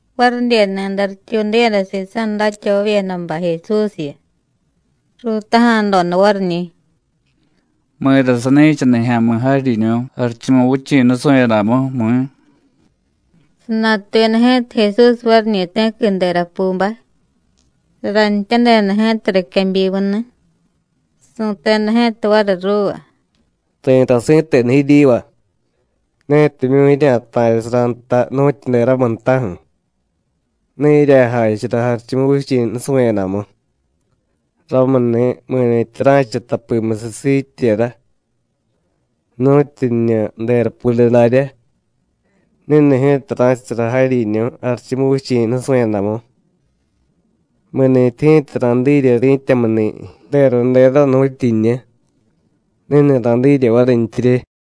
Varidyeni̱day rityuudiyada sisa̱ datyavavyedabay Jesúsyu, ruutaja̱doda variñi̱: “¿Mi̱ra sani̱cha nijya̱mi̱ jaryiñu̱ Jarichumuvichi̱ nusu̱yadamu, mi̱?” Sanatuyada ji̱ta Jesús variñi̱ ti̱qui derapubay, saranityadeda ji̱ta riquebyimuni̱. Su̱teda ji̱ta variy ruuva: “Ri̱tay si̱tenu jiryiva: Netimyu̱ jirya̱ta̱rya̱sara nta nu̱tyu deramiy ntaju̱, ne jirya̱jachara Jarichumuvichi̱ nusu̱yadamu. Ramuni̱ mi̱ni̱tyi ra̱cha tapimusiy siityera, nu̱tyu jiñu derapude daryá, ni̱ni̱ ji̱ta ra̱chasara jaryiñu̱ Jarichumuvichi̱ nusu̱yadamu. Mi̱nintyi ji̱ta ra̱dirye ri̱tyamuni̱ deradera nu̱tyu jiñu, ni̱ni̱ ra̱dirye varintyirye.”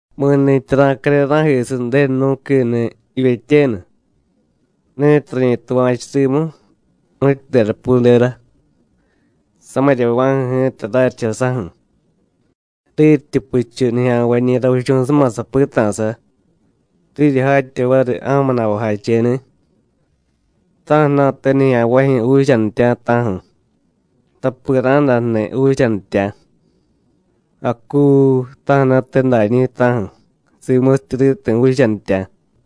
“Mi̱ni̱tyi ra̱care ra̱jisiy Ju̱denu nú̱quini̱ jivyetyenu, ni̱tiy rañi tuva̱chu rimu, nu̱tyu derapudera, samiryava̱ju̱ ji̱ta raryicha saju̱, riryityi puchu nijya̱nvañi̱ ravichu̱suma sapita̱sa, riryi jatya variy ja̱mu na̱vajacheni̱. Ta̱ju̱na̱te nijya̱nvajyu̱ juuchanitya̱, ta̱ju̱, tapi ra̱day jniy juuchanitya̱. ¡Acuu! ta̱ju̱na̱tedañi̱, ta̱ju̱, simusityi riti̱ juuchanitya̱.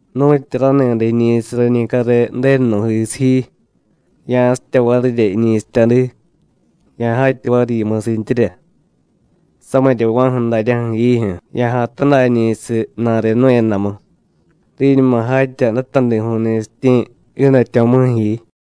Nu̱tyi rani̱day jiñi̱siy rañi care Ju̱denu nú̱jisiy ji, ya̱sitya varirya jiñi̱sityadi, ya̱jatya variy yimusintyirya. Samiryava̱ju̱ daryaju̱ jiijyu̱ ya̱jay tadañi̱siy ju̱na̱re jnu̱yadamu, riñuma jatya datadiju̱y ni̱sityi̱ jiidatyo̱vimuju̱ ji.”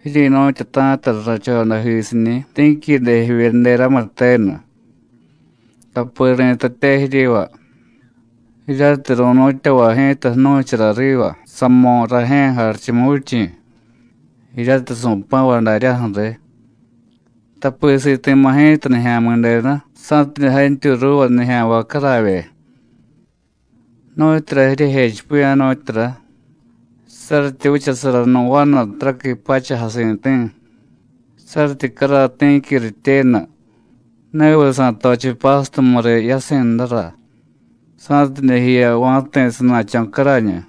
“Jiryi̱nu̱tyata̱ta rrachodajisiñi̱ ti̱quide jivye deramiy tenu, tapi ri̱tatye jiryiva jiryatiy ru̱nu̱tyavay ji̱ta jnu̱chara riva samo̱ Rajye̱ Jarichumuvichi̱, jiryatiy su̱pa̱vay daryaju̱ riy. Tapi siti̱ma̱ ji̱ta Nijya̱mi̱denu, sa̱tidye jantyuy ruuva nijya̱nvay caravye. ¿Nu̱tyura jiryejechipiya̱, nu̱tyura? Saryityi vichasara nu̱ vanu taraqui pacha jasi̱ti̱, saryityi caray ti̱qui rityenu, ¿neviy sa̱tochiy pástumu riy yasi̱ jnura, sa̱tidye jiya va̱ti̱ sana̱cho̱ carañu?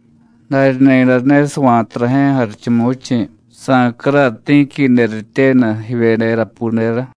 Darya ni̱day ne sava̱ta rajye̱ Jarichumuvichi̱ sa̱caray ti̱quide rityenu jivye derapudera.”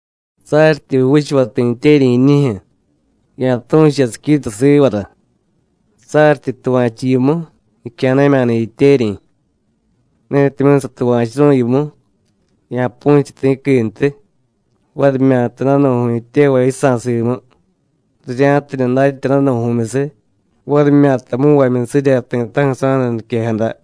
“Saryityi juuchuvay ti̱ jityeryi̱ jiiñijyu̱, ya̱tu̱chu yasiquita sivara. Saryityi tuva̱chu yimu, jicya̱na̱mya̱ni̱ jityeryi̱. Netimyu̱ satuva̱churu̱y yimu, ya̱pu̱chiy ti̱quintiy, varimyata danu̱ju̱y jityevay yisa̱ simu, rirya̱tidye datya danu̱ju̱myusiy, varimyata mu̱nvamyusirya ti̱ta̱ju̱ sa̱daniquejada.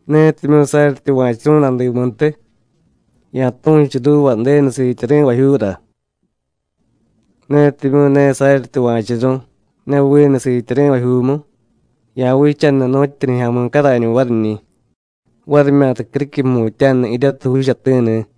Netimyu̱ saryi tuva̱churu̱y nadimuntiy, ya̱tu̱chu ruuva Ju̱denu siityari̱vajyuura. Netimyu̱ ne saryi tuva̱churu̱y ne vinu siityari̱vajyuumu, ya̱vichaniy nu̱tyu nijya̱mi̱ carañu variñi̱, varimyata criquiy jmutya̱nu jiryatiy juuchati̱ni̱.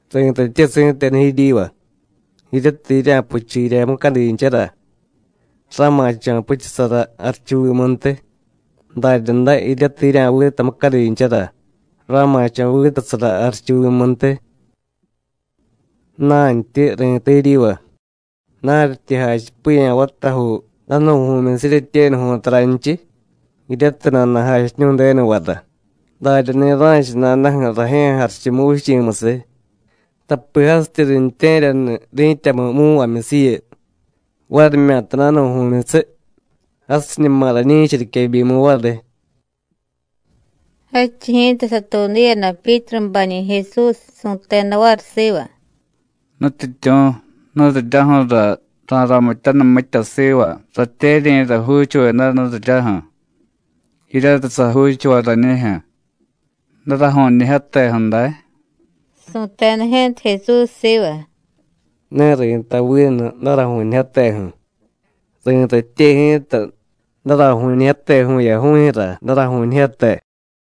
Ri̱tatye si̱tenu jiryiva: Jiryatiy jirya̱puchu jirya mucadinchara, ra̱ma̱cho̱ puchusara jarichuvimuntiy. Daryaday jiryatiy jirya̱vita mucadinchara, ra̱ma̱cho̱ vitasara jarichuvimuntiy. Ju̱na̱ntyi ri̱tay jiryiva: Naryityi jachipiya̱ vatajuu danu̱ju̱myusiy jiryetyenuju̱y taranchiy, jiryatiy nana̱jachiñu̱y Ju̱denuvara, daryani̱ ra̱cha nadaju̱ Rajye̱ Jarichumuvichi̱musiy. Tapi jasityi riintye̱ryaniy ri̱tyamu mu̱nvamyusiyu, varimyata danu̱ju̱myusiy, jasiñuma rañi̱cha riquebyimu variy.” Jadchiy ji̱ta satuudiyada Pyítrubañi̱ Jesús, su̱teda variy siva: “¿Nutyityu̱, nuriryaju̱ra ra̱ramityaniy mitya siva ratyeryi̱ra juuchuveda, nuriryaju̱? jiryatiy sajuuchuvay rañijyu̱. ¿Daraju̱ñijyateju̱ day?” Su̱teda ji̱ta Jesús siva: “Ne ri̱tay vinu daraju̱ñijyateju̱; ri̱tatye ji̱ta daraju̱ñijyate vu̱yaju̱jyu̱ra daraju̱ñijyate.”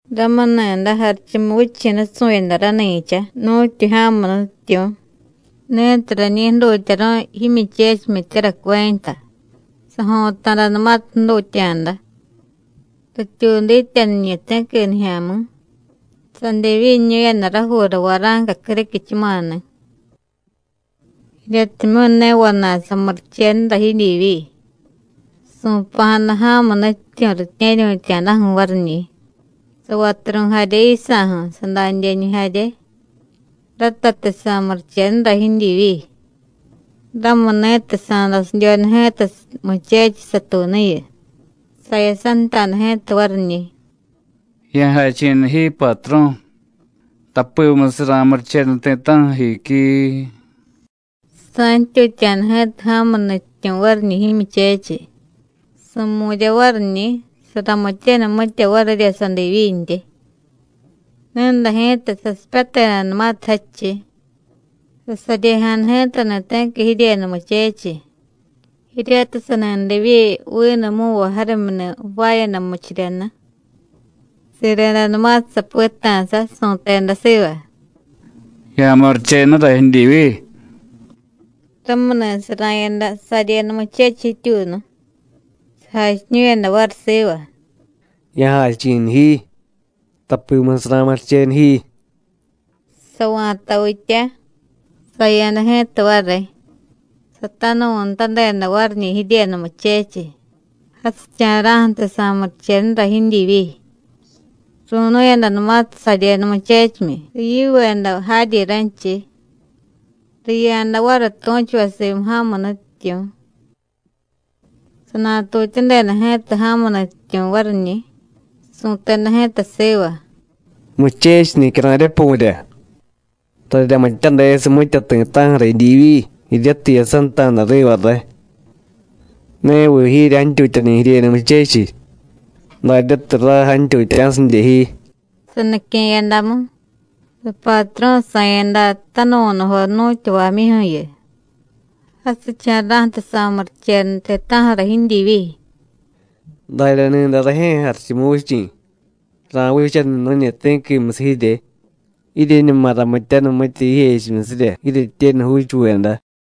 “Ramuni̱day Jarichumuvichi̱ nusu̱yada rani̱cha nu̱tyu ja̱mu nutyityu̱ ni̱tiy rañi jdutyaru̱y jimyuchechimyityara cuenta. Sajo̱ta̱danumatiy jdutya̱da, rityuudityaniñi̱ ti̱qui nijya̱mi̱, sadivyiñu̱yada rajuura vara̱nca criquichumani̱. Jiryatimyu̱ ne vana̱y samurichenura jidyivyi, su̱pa̱jada ja̱mu nutyityu̱ ritye̱ryu̱tya̱daju̱ variñi̱, savaturu̱y jarye yisa̱ju̱, sadadyeñu jarye, ratatiy sa̱murichenura jidyivyi. Ramuni̱tiy sa̱dasidyoda ji̱ta muchechiy satuunuyu, sayasanta̱da ji̱ta variñi̱: ‘¡Ya̱jachi̱niy ji, Patru̱, tapimusiy ra̱murichenu ti̱ta̱ju̱ jiquiii!’ Sa̱ntyutya̱da ji̱ta ja̱mu nutyityu̱ variñi̱ jimyuchechiy, su̱mu̱rya variñi̱, saramityaniy mitya varirya sadivyintyi. Ni̱day ji̱ta, sasipyatedanumatiy jadchiy, sasaryejada ji̱tani̱ ti̱qui jiryenu muchechiy, jiryatiy sani divyi vinu mu̱nvay jarimyuni̱ jvaayada murichiryani̱. Siredanumatiy sapita̱sa, su̱teda siva: ‘¡Ya̱murichenura jidyivyi!’ Ramuni̱ sara̱yada saryenu muchechiy jityuunu, sajachiñu̱yada variy siva: ‘Ya̱jachi̱niy ji, tapimusiy ra̱murichenu ji.’ Sava̱tavitya. Saya̱da ji̱ta variy, satanuvu̱nutadeda variñi̱ jiryenu muchechiy, jasicha̱ra̱ju̱tiy sa̱murichenura jidyivyi. Ru̱nu̱yadanumatiy saryenu muchechimyi, riyiveda jaryi ranchiy, riya̱da variy tu̱chuvay simu ja̱mu nutyityu̱. Sanatutyadeda ji̱ta ja̱mu nutyityu̱ variñi̱, su̱teda ji̱ta siva: ‘¡Muchechiy nicyara̱ryapu̱rya! Raryamityadesiy mitya ti̱ta̱ju̱ra jidyivyi, jiryatiy jiyasanta̱da riva ray. ¿Neviy jiryi jantyutyani̱ jiryenu muchechiy, daryatiy ray jantyutya̱sidye ji?’ Sanique̱yadamu, sapatru̱ sa̱yada tanuvu̱nujo jnu̱tyavamyuju̱yu, jasicha̱ra̱ju̱tiy sa̱murichenu ti̱ta̱ju̱ra jidyivyi. Darya ni̱day Rajye̱ Jarichumuvichi̱ ra̱vichaniy nu̱ñi ti̱quimusiy jirye, jiryeñuma ramityaniy mitya jijechimyusirya jiryetyenu juuchuveda.”